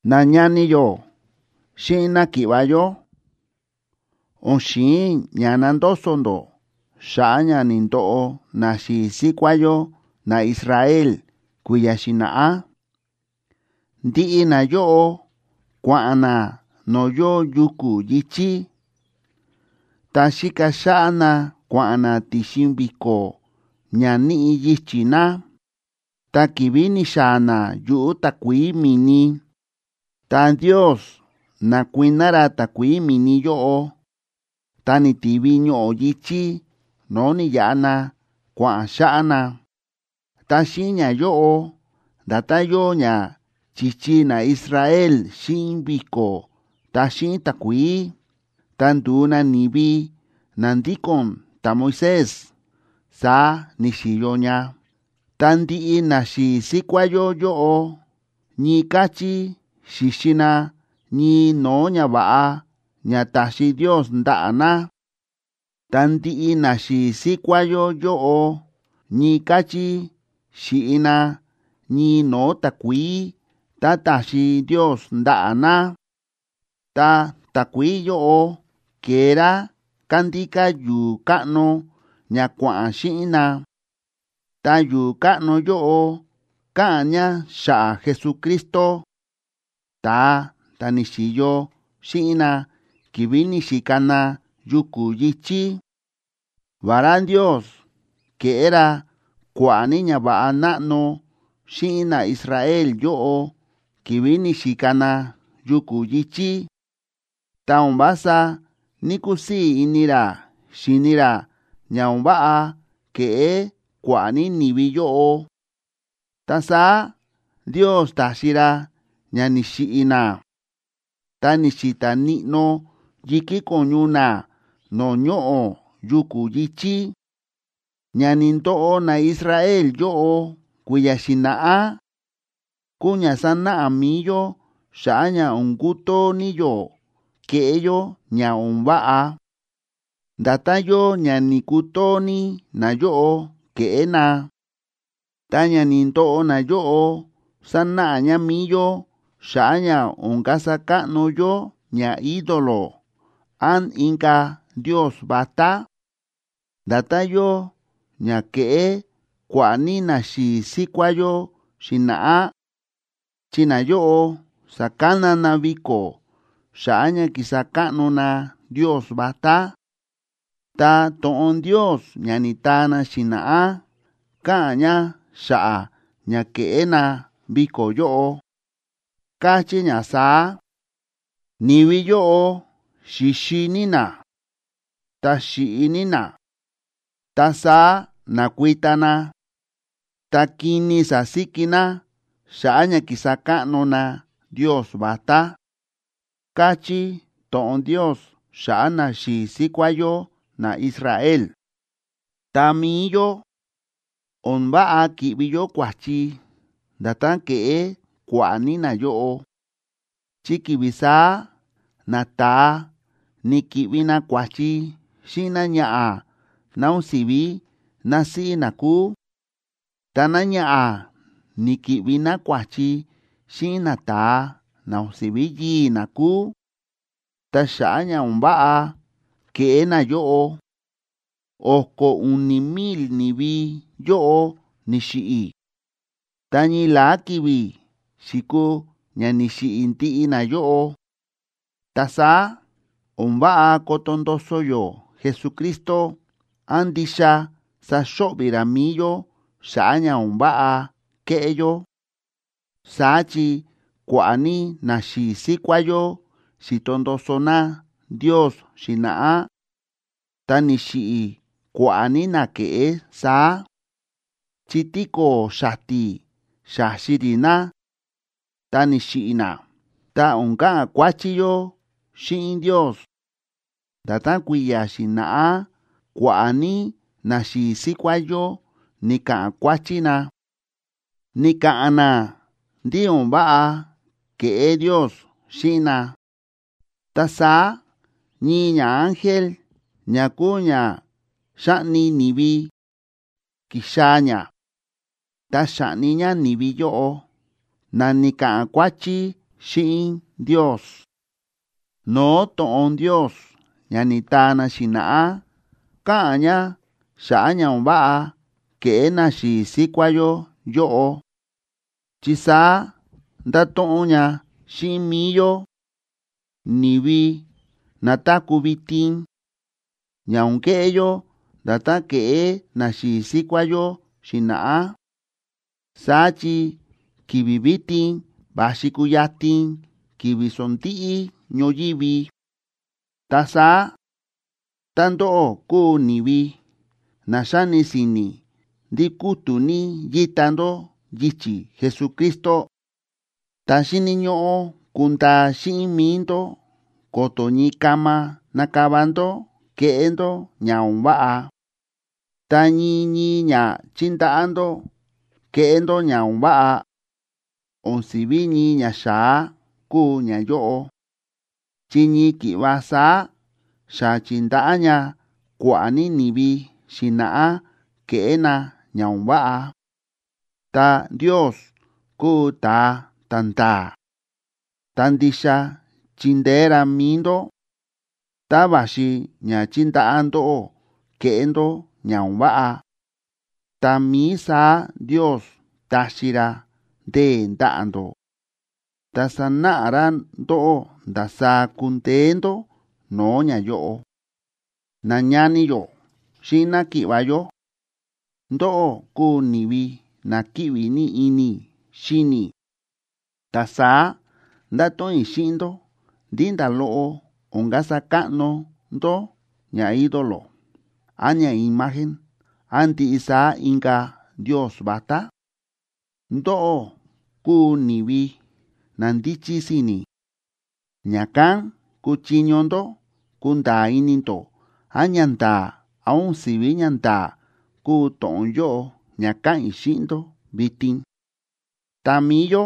Nañani yó xíꞌin náki̱ꞌva̱ yó, o̱n xi̱in i̱ ña nandoso ndó xa̱ꞌa̱ ña ni̱ndoꞌo naxi̱i̱ síkuá yó naIsrael kui̱ya̱ xi̱na̱ꞌá. Ndiꞌi nayóꞌo kua̱ꞌa̱n na no̱o̱ yóo yuku̱ yi̱chí, ta xíka xáꞌá na kua̱ꞌa̱n na ti̱xin vi̱ko̱ ña níꞌi yichi̱ na; ta ki̱vi̱ ni̱xaa̱ na yuꞌu̱ takuií mi̱ni, ta Ndios na̱kuiná ra takuií mi̱ni yóꞌo, ta ni̱tivi ñoꞌo̱ yi̱chí no̱o̱ ni̱yaꞌa na kua̱ꞌa̱n xáꞌá na. Ta xíꞌin ñayóꞌo, nda̱tán yóo ña chi̱chi naIsrael xíꞌin vi̱ko̱ ta xíꞌin takuií, ta ndu̱u na ni̱vi na ndíko̱n ta̱Moisés, saá ni̱xi̱yo ña. Ta ndiꞌi naxi̱i̱ síkuá yó yóꞌo ñii káchí xi̱xi na ñii no̱o̱ ñava̱ꞌa ña ta̱xi Ndios ndaꞌa̱ na. Ta ndiꞌi naxi̱i̱ síkuá yó yóꞌo ñii káchí xi̱ꞌi na ñii no̱o̱ takuií tá ta̱xi Ndios ndaꞌa̱ na. Ta takuií yóꞌo ke̱e rá kándíká yu̱u̱ káꞌno ña kua̱ꞌa̱n xíꞌin na, ta yu̱u̱ káꞌno yóꞌo káꞌa̱n ña xa̱ꞌa̱ Jesucristo, ta̱a ta̱ ni̱xi̱yo xíꞌin na ki̱vi̱ ni̱xika na yuku̱ yi̱chí. Vará Ndios ke̱ꞌé ra kua̱ꞌa̱ ní ñava̱ꞌa náꞌno xíꞌin naIsrael yóꞌo ki̱vi̱ ni̱xika na yuku̱ yi̱chí, ta o̱n vása ní‑kusii̱ ini ra xi̱ni ra ña o̱n váꞌa ke̱ꞌé kua̱ꞌa̱ ní ni̱vi yóꞌo. Ta saá Ndios ta̱xi ra ña ni̱xiꞌi̱ na, ta ni̱xi̱ta̱ níꞌnó yi̱kí ko̱ñu na no̱o̱ ñoꞌo̱ yuku̱ yi̱chí. Ña ni̱ndoꞌo naIsrael yóꞌo kui̱ya̱ xi̱na̱ꞌá, kúu ña sánáꞌa mi̱i yó xa̱ꞌa̱ ña o̱n kutoo ní yó keꞌé yó ña o̱n váꞌa, nda̱tán yóo ña ni̱ku̱too ní nayóꞌo kéꞌé na. Ta ña ni̱ndoꞌo nayóꞌo sánáꞌa ña mi̱i yó xa̱ꞌa̱ ña o̱n kasa káꞌno yó ñaídolo án inka̱ ndios vatá, nda̱tán yóo ña ke̱ꞌé kua̱ꞌa̱ ní naxi̱i̱ síkuá yó xi̱na̱ꞌá. Chi nayóꞌo sa̱kana na viko̱ xa̱ꞌa̱ ña kísa káꞌno na ndios vatá, ta to̱ꞌon Ndios ña ni̱taa na xi̱na̱ꞌá káꞌa̱n ña xa̱ꞌa̱ ña ke̱ꞌé na viko̱ yóꞌo, káchí ña saá: “Ni̱vi yóꞌo xi̱xi ní na, ta xi̱ꞌi ní na, ta saá na̱kuita na, ta kini sa̱síki na xa̱ꞌa̱ ña kísa káꞌno na ndios vatá”, káchí to̱ꞌon Ndios xa̱ꞌa̱ naxi̱i̱ síkuá yó naIsrael. Ta mi̱i yó, o̱n váꞌa ki̱ꞌvi yó kua̱chi nda̱tán ke̱ꞌé kua̱ꞌa̱ ní nayóꞌo, chi ki̱vi̱ saá nata̱a ni̱ki̱ꞌvi na kua̱chi xíꞌin náñaꞌa̱ ná o̱n si̱ví násíꞌí na kúu, ta náñaꞌa̱ ni̱ki̱ꞌvi ná kua̱chi xíꞌin nata̱a na o̱n si̱ví yii̱ ná kúu. Ta xa̱ꞌa̱ ña o̱n váꞌa ke̱ꞌé nayóꞌo, o̱ko̱ u̱ni̱ mil ni̱vi yóꞌo ni̱xiꞌi̱, ta ñii la̱á ki̱vi̱ xi̱kuu ña ni̱xiꞌi̱ ndiꞌi nayóꞌo. Ta saá o̱n váꞌa koto ndoso yó Jesucristo án ndixa saxo̱ꞌvi̱ ra mi̱i yó xa̱ꞌa̱ ña o̱n váꞌa kéꞌé yó. Saá chi kua̱ꞌa̱ ní naxi̱i̱ síkuá yó xi̱to ndoso na Ndios xi̱na̱ꞌá, ta ni̱xiꞌi̱ kua̱ꞌa̱ ní na ke̱ꞌé saá, chi tíko̱o̱ xati̱ xa̱xi rí na ta ni̱xiꞌi̱ na. Ta o̱n ka̱ꞌa̱n kuáchí yó xíꞌin Ndios, nda̱tán kui̱ya̱ xi̱na̱ꞌá kua̱ꞌa̱ ní naxi̱i̱ síkuá yó ni̱ka̱ꞌa̱n kuáchí na, ni̱ka̱ꞌa̱n na ndí o̱n váꞌa ke̱ꞌé Ndios xíꞌin na. Ta saá ñii ñaángel ña kúu ña xáꞌni ni̱vi, ki̱xaa̱ ña, ta xa̱ꞌni ña ni̱vi yóꞌo na ni̱ka̱ꞌa̱n kuáchí xíꞌin Ndios. No̱o̱ to̱ꞌon Ndios ña ni̱taa na xi̱na̱ꞌá káꞌa̱n ña xa̱ꞌa̱ ña o̱n váꞌa ke̱ꞌé naxi̱i̱ síkuá yó yóꞌo, chi saá ndáto̱ꞌon ña xíꞌin mi̱i yó, ni̱vi na táku̱ vitin, ña o̱n keꞌé yó nda̱tán ke̱ꞌé naxi̱i̱ síkuá yó xi̱na̱ꞌá. Saá chi ki̱vi̱ vitin va̱xi kuyatin ki̱vi̱ sondíꞌí ñoyívi. Ta saá, tá ndóꞌó kúu ni̱vi na xáni si̱ni̱ ndí kútu̱ ní yíta ndó yichi̱ Jesucristo, ta xíni̱ ñóꞌó kundaa xíꞌin mi̱i ndó ko̱to̱ ñii kama nakava ndó keꞌé ndó ña o̱n váꞌa. Ta ñii ñii ña chíndaꞌá ndó keꞌé ndó ña o̱n váꞌa, o̱n si̱ví ñii ñaxa̱á kúu ñayóꞌo, chi ñii ki̱ꞌva saá xa chi̱ndaꞌá ña kua̱ꞌa̱ ní ni̱vi xi̱na̱ꞌá keꞌé na ña o̱n váꞌa. Ta Ndios kúu ta̱a ta̱nda̱a̱, ta ndixa chindeé ra mi̱i ndó. Tá va̱xi ña chíndaꞌá ndóꞌó keꞌé ndó ña o̱n váꞌa, tá mií saá Ndios taxi ra ndee̱ ndaꞌa̱ ndó, ta sanáꞌa ra ndóꞌó ndasaá kundeé ndó no̱o̱ ñayóꞌo. Nañani yó xíꞌin náki̱ꞌva̱ yó, ndóꞌó kúu ni̱vi na kíꞌvi ní ini i̱ xíni i̱. Ta saá ndáto̱ꞌon i̱ xíꞌin ndó ndí nda̱ loꞌo o̱n kasa káꞌno ndó ñaídolo án ñaimagen án ndiꞌi saá inka̱ ndios vatá. Ndóꞌó kúu ni̱vi na ndíchí si̱ni̱, ña̱kán kúchiño ndó kunda̱a̱ ini ndó án ñanda̱a̱ án o̱n si̱ví ñanda̱a̱ kúu to̱ꞌon yóꞌo ña káꞌa̱n i̱ xíꞌin ndó vitin. Ta mi̱i yó,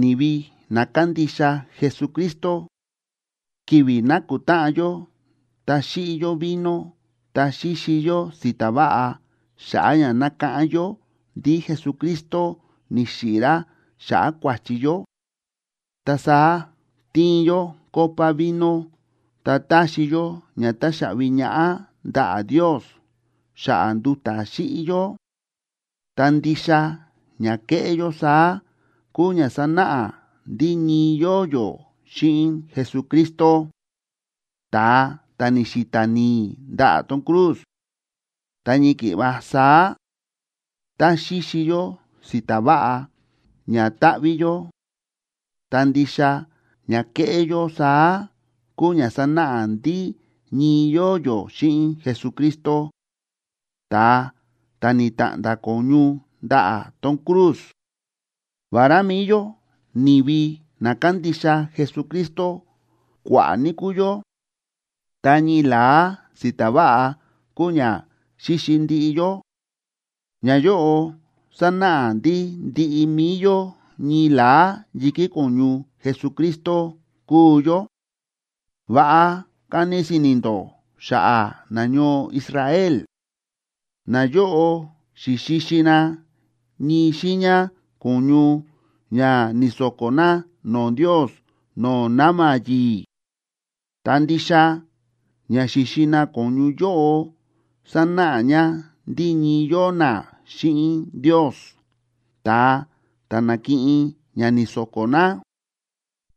ni̱vi na kándixa Jesucristo, ki̱vi̱ nákutáꞌan yó ta xíꞌi yó vino ta xíxi yó si̱ta̱ váꞌa xa̱ꞌa̱ ña nákáꞌán yó ndí Jesucristo ni̱xiꞌi̱ ra xa̱ꞌa̱ kua̱chi yó, ta saá tíin yó copa vino ta táxi yó ña táxaꞌvi ñaꞌá ndaꞌa̱ Ndios xa̱ꞌa̱ nduta̱ xíꞌi yó. Ta ndixa ña kéꞌé yó saá kúu ña sánáꞌa ndí ñii yóo yó xíꞌin Jesucristo, ta̱a ta̱ ni̱xi̱ta̱ ni̱i̱ ndaꞌa̱ tón cruz. Ta ñii ki̱ꞌva saá, tá xíxi yó si̱ta̱ váꞌa ña táꞌví yó, ta ndixa ña kéꞌé yó saá kúu ña sánáꞌa ndí ñii yóo yó xíꞌin Jesucristo, ta̱a ta̱ ni̱ta̱ꞌnda̱ ko̱ñu ndaꞌa̱ tón cruz. Vará mi̱i yó ni̱vi na kándixa Jesucristo kua̱ꞌa̱ ní kúu yó, ta ñii la̱á si̱ta̱ váꞌa kúu ña xíxi ndiꞌi yó. Ñayóꞌo sánáꞌa ndí ndiꞌi mi̱i yó ñii la̱á yi̱kí ko̱ñu Jesucristo kúu yó. Va̱ꞌa kani si̱ni̱ ndó xa̱ꞌa̱ nañoo Israel. Nayóꞌo xi̱xixi na ñii xiiña ko̱ñu ña ni̱so̱ko̱ na no̱o̱ Ndios no̱o̱ na̱ma̱ yi̱i̱. Ta ndixa ña xi̱xi na ko̱ñu yóꞌo sánáꞌa ña ndí ñii yóo na xíꞌin Ndios ta̱a ta̱ na̱kiꞌin ña ni̱so̱ko̱ na,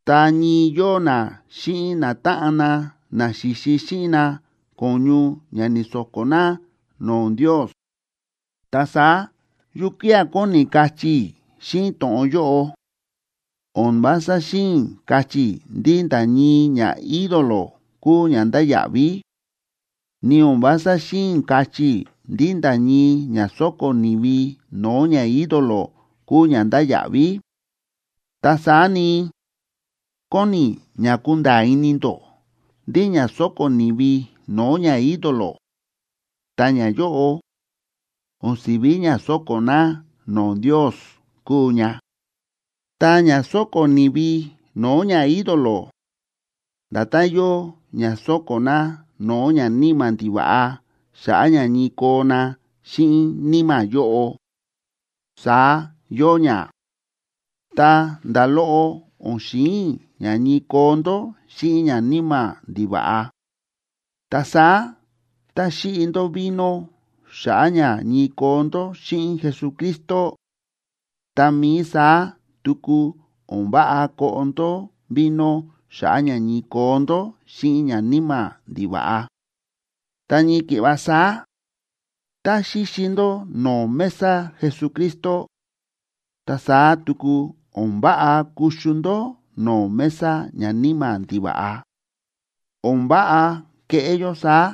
ta ñii yóo na xíꞌin natáꞌan na na xi̱xi xíꞌin na ko̱ñu ña ni̱so̱ko̱ na no̱o̱ Ndios. Ta saá, ¿yukía̱ kóni i̱ kachí i̱ xíꞌin to̱ꞌon yóꞌo? O̱n vása xi̱in i̱ kachí i̱ ndí nda̱ ñii ñaídolo kúu ña ndáya̱ꞌví. Ni o̱n vása xi̱in i̱ kachí i̱ ndí nda̱ ñii ña sóko̱ ni̱vi no̱o̱ ñaídolo kúu ña ndáya̱ꞌví. Ta saá ni, kóni i̱ ña kunda̱a̱ ini ndó ndí ña sóko̱ ni̱vi no̱o̱ ñaídolo, ta ñayóꞌo, o̱n si̱ví ña sóko̱ na no̱o̱ Ndios kúu ña. Ta ña sóko̱ ni̱vi no̱o̱ ñaídolo, nda̱tán yóo ña sóko̱ na no̱o̱ ñaníma̱ ndiva̱ꞌa xa̱ꞌa̱ ña ñii koo na xíꞌin níma̱ yóꞌo, saá yóo ña. Ta nda̱ loꞌo o̱n xi̱in i̱ ña ñii koo ndó xíꞌin ñaníma̱ ndiva̱ꞌa. Ta saá tá xíꞌi ndó vino xa̱ꞌa̱ ña ñii koo ndó xíꞌin Jesucristo, tá mií saá tuku o̱n váꞌa koꞌo ndó vino xa̱ꞌa̱ ña ñii koo ndó xíꞌin ñaníma̱ ndiva̱ꞌa. Ta ñii ki̱ꞌva saá, tá xíxi ndó no̱o̱ mesa Jesucristo, ta saá tuku o̱n váꞌa kuxu ndó no̱o̱ mesa ñaníma̱ ndiva̱ꞌa. O̱n váꞌa keꞌé yó saá,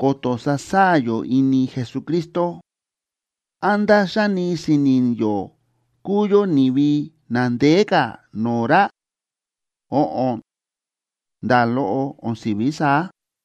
ko̱to̱ sasaa̱ yó ini Jesucristo. ¿Án ndá xáni si̱ni̱ yó kúu yó ni̱vi na ndeé ka̱ no̱o̱ ra? Óꞌon, nda̱ loꞌo o̱n si̱ví saá.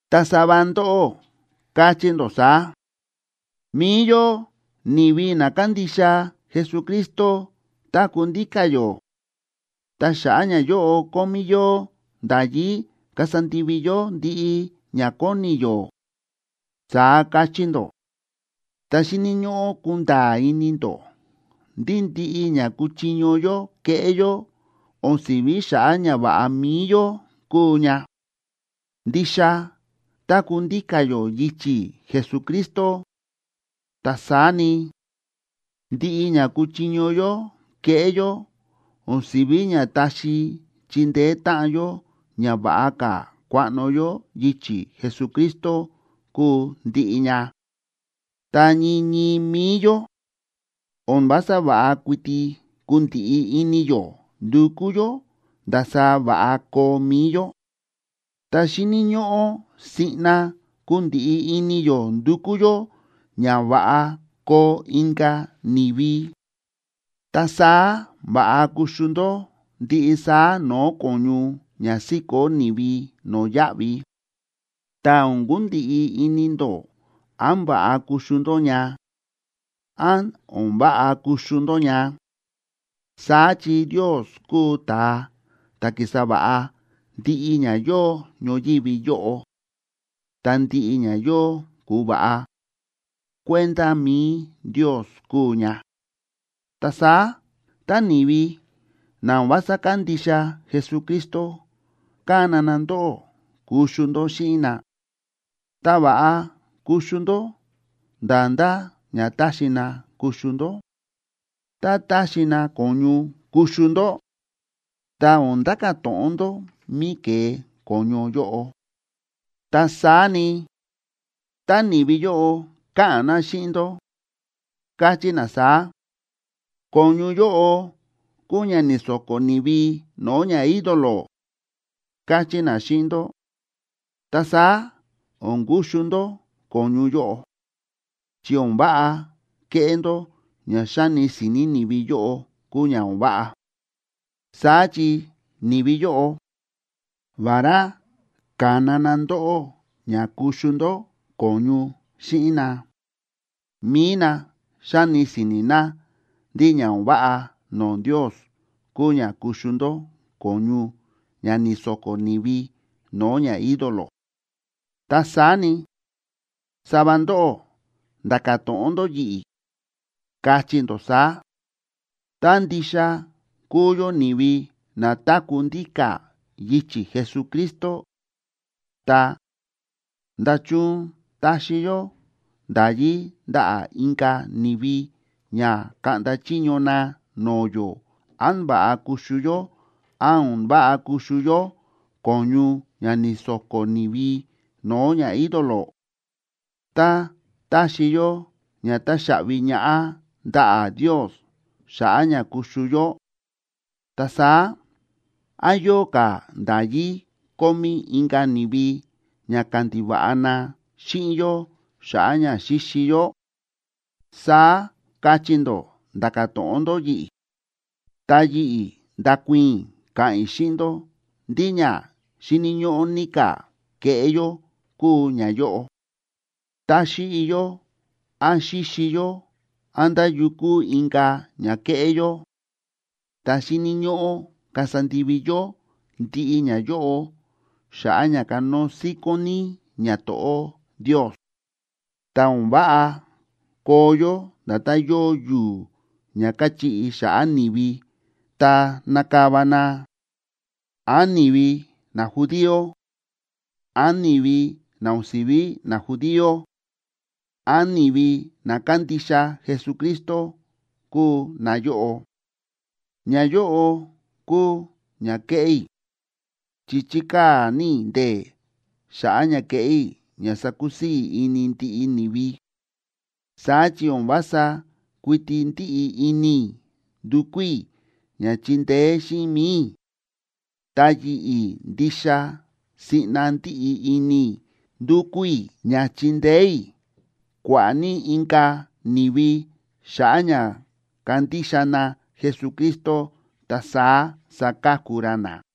Ta sava ndóꞌó káchí ndó saá: “Mi̱i yó ni̱vi na kándixa Jesucristo táku̱ ndíka̱ yó. Ta xa̱ꞌa̱ ñayóꞌo kómí yó nda̱yí kasa ndivi yó ndiꞌi ña kóni yó”, saá káchí ndó. Ta xíni̱ ñóꞌó kunda̱a̱ ini ndó ndí ndiꞌi ña kúchiño yó keꞌé yó o̱n si̱ví xa̱ꞌa̱ ñava̱ꞌa mi̱i yó kúu ña. Ndixa táku̱ ndíka̱ yó yichi̱ Jesucristo, ta saá ni, ndiꞌi ña kúchiño yó keꞌé yó o̱n si̱ví ña taxi chindeé táꞌan yó ña va̱ꞌa ka̱ kuaꞌno yó yichi̱ Jesucristo kúu ndiꞌi ña. Ta ñii ñii mi̱i yó, o̱n vása va̱ꞌa kuiti kundiꞌi ini yó ndukú yó ndasaá va̱ꞌa koo mi̱i yó, ta xíni̱ ñóꞌó siꞌna kundiꞌi ini yó ndukú yó ña va̱ꞌa koo inka̱ ni̱vi. Ta saá va̱ꞌa kuxu ndó ndiꞌi saá no̱o̱ ko̱ñu ña síkó ni̱vi no̱yáꞌvi, ta o̱n kundiꞌi ini ndó án va̱ꞌa kuxu ndó ña, án o̱n váꞌa kuxu ndó ña. Saá chi Ndios kúu ta̱a ta̱ ki̱sa va̱ꞌa ndiꞌi ña yóo ñoyívi yóꞌo, ta ndiꞌi ña yóo ku̱va̱ꞌa, kuenda mi̱i Ndios kúu ña. Ta saá tá ni̱vi na o̱n vása kándixa Jesucristo kána na ndóꞌó kuxu ndó xíꞌin na, ta va̱ꞌa kuxu ndó nda̱ ndá ña taxi na kuxu ndó. Tá táxi na ko̱ñu kuxu ndó, ta o̱n nda̱ka̱ to̱ꞌon ndó mí ke̱e ko̱ñu yóꞌo. Ta saá ni, tá ni̱vi yóꞌo káꞌa̱n na xíꞌin ndó, káchí na saá: “Ko̱ñu yóꞌo kúu ña ni̱so̱ko̱ ni̱vi no̱o̱ ñaídolo”, káchí na xíꞌin ndó, ta saá o̱n kuxu ndó ko̱ñu yóꞌo, chi o̱n váꞌa keꞌé ndó ña xáni si̱ni̱ ni̱vi yóꞌo kúu ña o̱n váꞌa. Saá chi ni̱vi yóꞌo, vará ka̱na na ndóꞌó ña kuxu ndó ko̱ñu xíꞌin na, mi̱i na xáni si̱ni̱ na ndí ña o̱n váꞌa no̱o̱ Ndios kúu ña kuxu ndó ko̱ñu ña ni̱so̱ko̱ ni̱vi no̱o̱ ñaídolo. Ta saá ni, sava ndóꞌó nda̱ka̱ to̱ꞌon ndó yi̱ꞌi̱, kachí ndó saá: “Tá ndixa kúu yó ni̱vi na táku̱ ndíka̱ yichi̱ Jesucristo, ta, ¿nda̱chun taxi yó nda̱yí ndaꞌa̱ inka̱ ni̱vi ña kaꞌnda chiño na no̱o̱ yó án va̱ꞌa kuxu yó án o̱n váꞌa kuxu yó ko̱ñu ña ni̱so̱ko̱ ni̱vi no̱o̱ ñaídolo? Tá taxi yó ña táxaꞌvi ñaꞌá ndaꞌa̱ Ndios xa̱ꞌa̱ ña kuxu yó, ta saá ¿án yóo ka̱ nda̱yí kómí inka̱ ni̱vi ña kandiva̱ꞌa na xíꞌin yó xa̱ꞌa̱ ña xíxi yó?”, saá kachí ndó nda̱ka̱ to̱ꞌon ndó yi̱ꞌi̱. Ta yi̱ꞌi̱ ndakuii̱n i̱ ka̱ꞌa̱n i̱ xíꞌin ndó ndí ña xíni̱ ñóꞌó ní ka̱ keꞌé yó kúu ñayóꞌo: tá xíꞌi yó án xíxi yó án nda̱ yu kúu inka̱ ña kéꞌé yó, ta xíni̱ ñóꞌó kasa ndivi yó ndiꞌi ñayóꞌo xa̱ꞌa̱ ña kanóo síkón ní ñato̱ꞌó Ndios. Ta o̱n váꞌa koo yó nda̱tán yóo yu̱u̱ ña káchiꞌi xa̱ꞌa̱ ni̱vi ta nákava na, án ni̱vi najudío, án ni̱vi na o̱n si̱ví najudío, án ni̱vi na kándixa Jesucristo kúu nayóꞌo. Ñayóꞌo kúu ña kéꞌé i̱, chi chíkaa̱ ní i̱ ndee̱ xa̱ꞌa̱ ña keꞌé i̱ ña sakusii̱ ini ndiꞌi ni̱vi. Saá chi o̱n vása kuiti ndíꞌi ini i̱ ndukú i̱ ña chindeé xíꞌin mi̱i i̱, ta yi̱ꞌi̱ ndixa siꞌna ndíꞌi ini i̱ ndukú i̱ ña chindeé i̱ kua̱ꞌa̱ ní inka̱ ni̱vi xa̱ꞌa̱ ña kandixa na Jesucristo ta saá saka̱ku ra na.